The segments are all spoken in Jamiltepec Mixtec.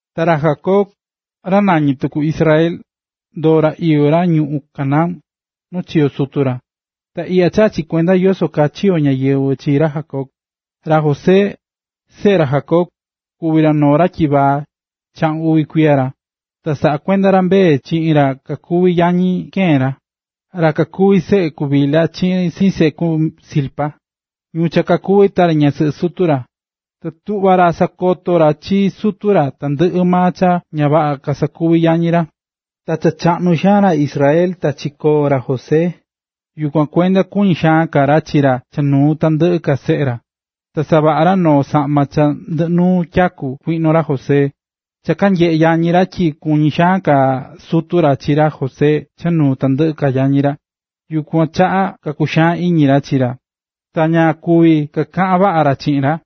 Ta ra Jacob, ra nañí tuku Israel, ndoo̱ ra iyó ra ñuꞌún Canaán, nu chiyo̱ sutu ra. Ta iꞌya chaꞌá chi kuenda yoso kaa chiyo̱ ñáyɨvɨ chi ra Jacob: Ra José, seꞌe ra Jacob, kuví ra noo ra tyivaa, chaꞌun uvi kuiya ra, ta saꞌakuendá ra mbee chiꞌin ra kakuví yañi keen ra, ra kakuví seꞌe ku Bilha chiꞌin seꞌe ku Zilpa, ñu cha kakuví tari ñasɨꞌɨ sutu ra. Ta tuꞌva ra sakotó ra chi sutu ra tandɨꞌɨ maa cha ña vaꞌa cha kasakuví yañi ra. Cha chaꞌnu xaan ra Israel ta chikóo ra José, yukuan kuenda kuñí xaan ka ra chi ra cha nuu tandɨꞌɨ ka seꞌe ra, ta savaꞌa̱ ra noo saꞌma cha ndɨꞌɨ nuu tyaku kuiꞌno ra José. Cha kanyeꞌé yañi ra tyi kuñí xaan ka sutu ra chi ra José cha nuu tandɨꞌɨ ka yañi ra. Yukuan chaꞌa kakuxaan iñi ra chi ra. Ta ña kuví kakaꞌan vaꞌa ra chiꞌin ra.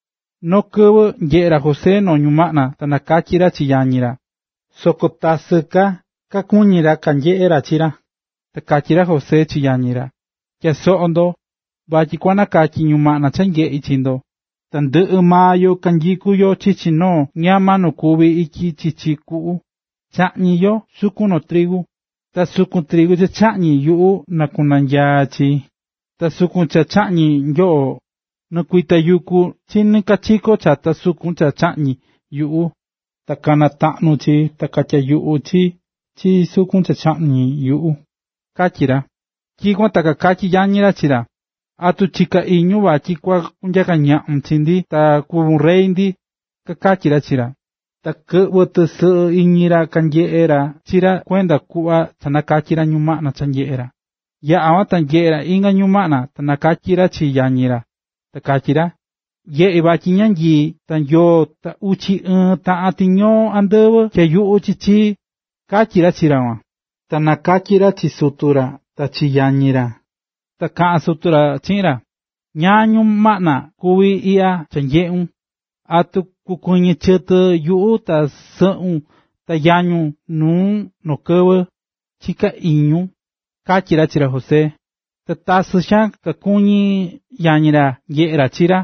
Noo kɨvɨ nyeꞌe̱ ra José noo ñumaꞌna ta nakatyi̱ ra chi yañi ra. Soko tasɨ ka kakuñi̱ ra kanyeꞌe̱ ra chi ra. Ta katyí ra José chi yañi ra: ―Tya̱a soꞌo ndo, vatyi kua nakatyi ñumaꞌna cha nyeꞌi̱ chi ndo. Tandɨꞌɨ maa yo kanyikú yo chichi noo ñama nu kuví ityi chichi kuꞌu, chaꞌñí yo sukun trigu. Ta sukun trigu cha chaꞌñi̱ yuꞌu nɨkuinanyaa̱ ndoo chi, ta sukun cha cha chaꞌñi̱ nyoꞌo nɨkuitayukú chi nikachiko chata sukun cha chaꞌñi̱ yuꞌu, ta kanataꞌnu̱ chi ta katyayuꞌu̱ chi chi sukun cha chaꞌñi̱ yuꞌu ―katyí ra. Tyikuan ta kakatyí yañi ra chi ra: ―¿Atu chiká iñun vatyi kua kunyaka ñaꞌun chi ndi ta kua kuvun rey ndi? ―kakatyí ra chi ra. Ta kɨꞌvɨ̱ tɨsɨꞌɨ iñi ra kanyeꞌe̱ ra chi ra cha kuenda kuꞌva nakatyi̱ ra ñumaꞌna cha nyeꞌe̱ ra. Yaꞌa̱ kuan ta nyeꞌe̱ ra inga ñumaꞌna, ta nakatyi̱ ra chi yañi ra. Ta katyí ra: ―Nyeꞌi̱ vatyi ñanyii ta yoo ta uchi ɨɨn taꞌan tiñoo andɨvɨ tyayuꞌú tɨ chii ―katyí ra chi ra kuan. Ta nakatyi̱ ra chi sutu ra ta chi yañi ra. Ta kaꞌa̱n sutu ra chi ra: ―¿Ñáá ñumaꞌna kuví iꞌya cha nyeꞌu̱n? ¿Atu kukuɨñɨ chɨtɨ yuꞌu ta sɨꞌun ta yañun nuun noo kɨvɨ, chiká iñun? ―katyí ra chi ra José. Ta tasɨ xaan kakuñí yañi ra nyeꞌé ra chi ra,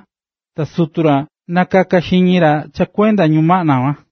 ta sutu ra nakaká xiñi ra cha kuenda ñumaꞌna kuan.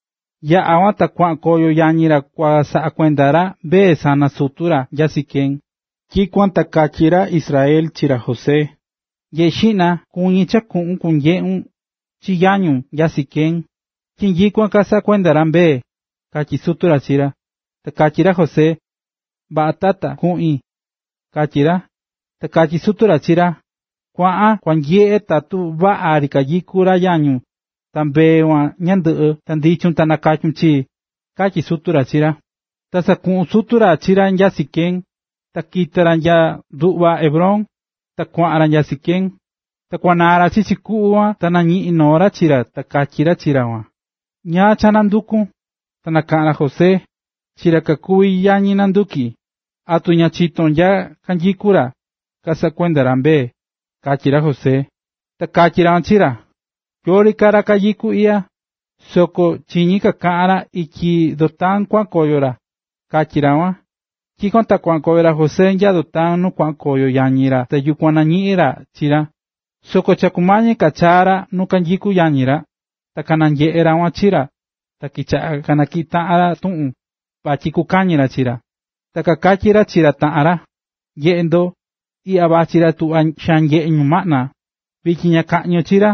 Yaꞌa̱ kuan ta kuaꞌan koyo yañi ra kua saꞌa kuenda ra mbee sana sutu ra nya Siquem. Tyikuan ta katyí ra Israel chi ra José: ―Nye̱ꞌe xiꞌna, kuñí cha kuꞌun kunyeꞌun chi yañun nya Siquem, tyi nyikuan kasaꞌá kuenda ra mbee ―katyí sutu ra chi ra. Ta katyi ra José: ―Vaꞌa tata, kuꞌin ―katyí ra. Ta katyí sutu ra chi ra: ―Kua̱ꞌan, kua nyeꞌe tatu vaꞌa ri kanyikú ra yañun ta mbee kuan ñandɨꞌɨ, ta ndichun ta nakatyun chii―katyí sutu ra chi ra. Ta sakuꞌu̱n sutu ra chi ra nya Siquem, ta kita̱ ra nya nduꞌva Hebrón, ta kuaꞌan ra nya Siquem. Ta kuanaa̱ ra chichi kuꞌu kuan ta nañiꞌi̱n noo ra chi ra ta katyí ra kuan chi ra: ―¿Ñáá cha nandukún? Ta nakaꞌa̱n ra José: ―Chi ra kakuví yañi nandukí, ¿atu ña chitón nya kanyikú ra, kasaꞌakumí ra mbee? ―katyí ra José. Ta katyí ra kuan chi ra: ―Yori ka ra kanyikú iꞌya, soko chiñi̱ kakaꞌán ra tyi ityi Dotán kuaꞌan koyo ra ―katyí ra kuan. Tyikuan ta kuaꞌan ra José nya Dotán nu kuaꞌan koyo yañi ra ta yukuan nañiꞌi̱n ra chi ra. Soko cha kumañí ka chaa ra nu kanyikú yañi ra, ta kananyeꞌe̱ ra kuan chi ra, ta kichaꞌa̱ kanatyiꞌí taꞌan ra tuꞌun vatyi kukaꞌñi ra chi ra. Ta kakatyí ra chi ra taꞌan ra: ―¡Nye̱ꞌe ndo, iꞌya vachí ra cha tuꞌvá xaan nyeꞌé ñumaꞌna! Vityin na kaꞌñi yo chi ra,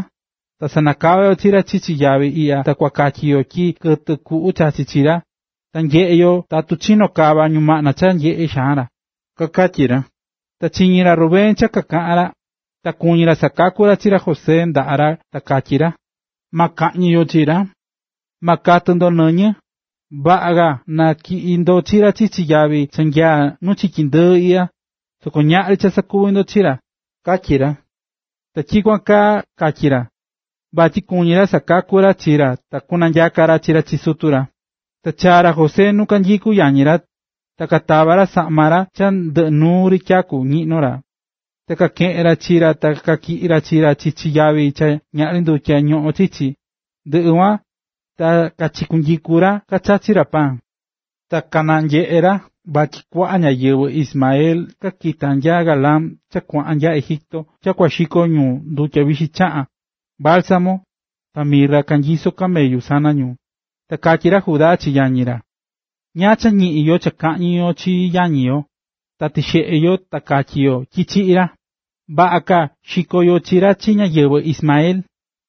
ta sanakava yo chi ra chichi yavi iꞌya ta kua katyi yo tyi kɨtɨ kuꞌu chachi̱ chi ra. Ta nyeꞌe yo tatu kuchino kava ñumaꞌna cha nyeꞌé xaan ra ―kakatyí ra. Ta chiñi̱ ra Rubén cha kakaꞌán ra, ta kuñí ra sakaku ra chi ra José ndaꞌa ra ta katyí ra: ―Ma kaꞌñi yo chi ra. Ma katɨ ndo nɨñɨ, vaꞌa ka na tyiꞌi ndo chi ra chichi yavi cha nyaá nu chiki ndɨɨ iꞌya, soko ñaꞌri sakuvi ndo chi ra ―katyí ra. Ta tyikuan kaa katyí ra, vatyi kuñí ra sakaku ra chi ra ta kunanyaka ra chi ra chi sutu ra. Ta chaa̱ ra José nu kanyikú yañi ra, ta katava̱ ra saꞌma cha ndɨꞌɨ nuu ri tyaku ñiꞌnó ra. Ta kakeꞌe̱n ra chi ra ta katyiꞌi̱ ra chi ra chichi yavi cha ñaꞌri ndutya ñoꞌón chichi. Ndɨꞌɨ kuan ta kachikunyiku̱ ra kachachí ra paan. Ta kananyeꞌe̱ ra vachí kuaꞌa ñáyɨvɨ Ismael cha kita̱ nya Galaad cha kuaꞌan nya Egipto cha kua xiko ñu ndutya vixi chaꞌán, bálsamo, ta mirra kanyisó camellu sana ñu. Ta katyí ra Judá chi yañi ra: ―¿Ñáá cha ñiꞌin yo cha kaꞌñi yo chi yañi yo, ta tixeꞌe yo ta katyi yo tyi chiꞌi̱ ra? Vaꞌa ka xiko yo chi ra chi ñáyɨvɨ Ismael,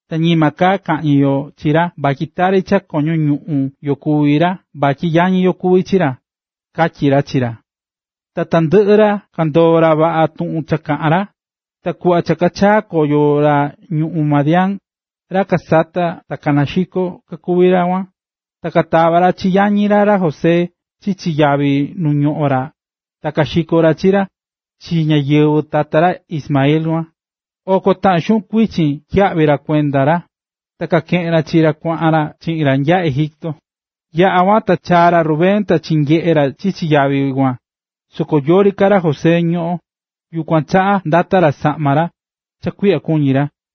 ta ñima ka cha kaꞌñi yo chi ra vatyi tari cha koño ñuꞌún yo kuví ra vatyi yañi yo kuví chi ra ―katyí ra chi ra. Ta tandɨꞌɨ ra kandoo̱ ra vaꞌa tuꞌun kaꞌa̱n ra. Ta kuꞌva cha kayaꞌa̱ koyo ra ñuꞌún Madián, ra kasatá ta naxikó kakuví ra kuan, ta katava̱ yañi ra José chi ra chichi yavi nu ñoꞌón ra ta kaxiko̱ ra chi ra, chi ñáyɨvɨ tata ra Ismael kuan. Oko taꞌan xuꞌun kuichin tyiyaꞌvi̱ ra kuenda ra, ta kakeꞌe̱n ra chi ra kuaꞌan ra chiꞌin ra nya Egipto. Yaꞌa̱ kuan, ta chaa̱ ra Rubén ta chinyeꞌe̱ ra chichi yavi kuan, soko yori ka ra José ñoꞌo̱n, yukuan chaꞌa ndata̱ ra saꞌma ra, cha kuiꞌya kuñí ra.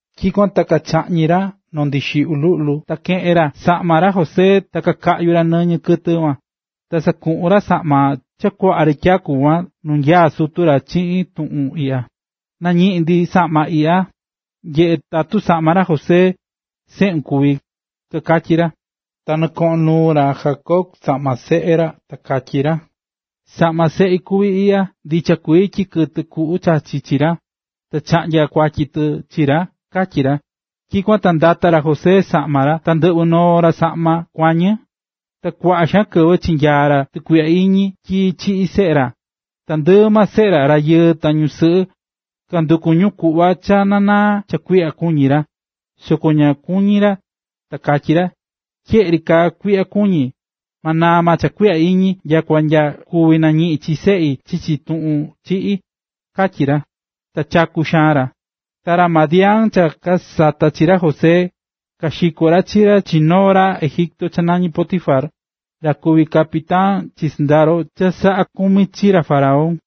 Tyikuan ta kachaꞌñi̱ ra noo ndixiꞌyu luꞌlu ta keꞌe̱n ra saꞌma ra José ta kakaꞌyu̱ ra nɨñɨ kɨtɨ kuan. Ta sakuꞌu̱n ra saꞌma cha kuaꞌa ri tyaku kuan nu nyaá sutu ra chiꞌin tuꞌun iꞌya: “Nañiꞌi̱n ndi saꞌma iꞌya, nye̱ꞌe tatu saꞌma ra José, seꞌun, kuví”, kakatyí ra. Ta nɨkoꞌon nuu ra Jacob saꞌma seꞌe ra ta katyí ra: “Saꞌma seꞌi kuví iꞌya, ndicha kuii tyi kɨtɨ kuꞌu chachi̱ chi ra, ta chaꞌnya̱ kuatyi tɨ chi ra”, katyí ra. Tyikuan ta ndata̱ ra Jacob saꞌma ra, ta ndɨꞌvɨ̱ noo ra saꞌma kuañɨ, ta kuaꞌa xaan kɨvɨ chinyaa̱ ra tukuiꞌya iñi tyi chiꞌi̱ seꞌe ra. Tandɨꞌɨ maa seꞌe ra, rayɨɨ ta ñusɨꞌɨ, kanduku̱ ñu kuꞌva na naa cha kuiꞌya kuñí ra, soko ña kuñí ra, ta katyí ra: “¡Tyeꞌe ri kaa kuiꞌya kuñí, ma naa maa cha kuiꞌya iñi nyakua nya kúvi ta nañiꞌin chi seꞌi chichi tuꞌun chiꞌí”, katyí ra. Ta chaku̱ xaan ra. Ta ra Madián cha kasata̱ chi ra José, kaxiko̱ ra chi ra chi noo ra Egipto cha nañí Potifar, ra kuví capitán chi sɨndaro cha saꞌá kumi chi ra faraón.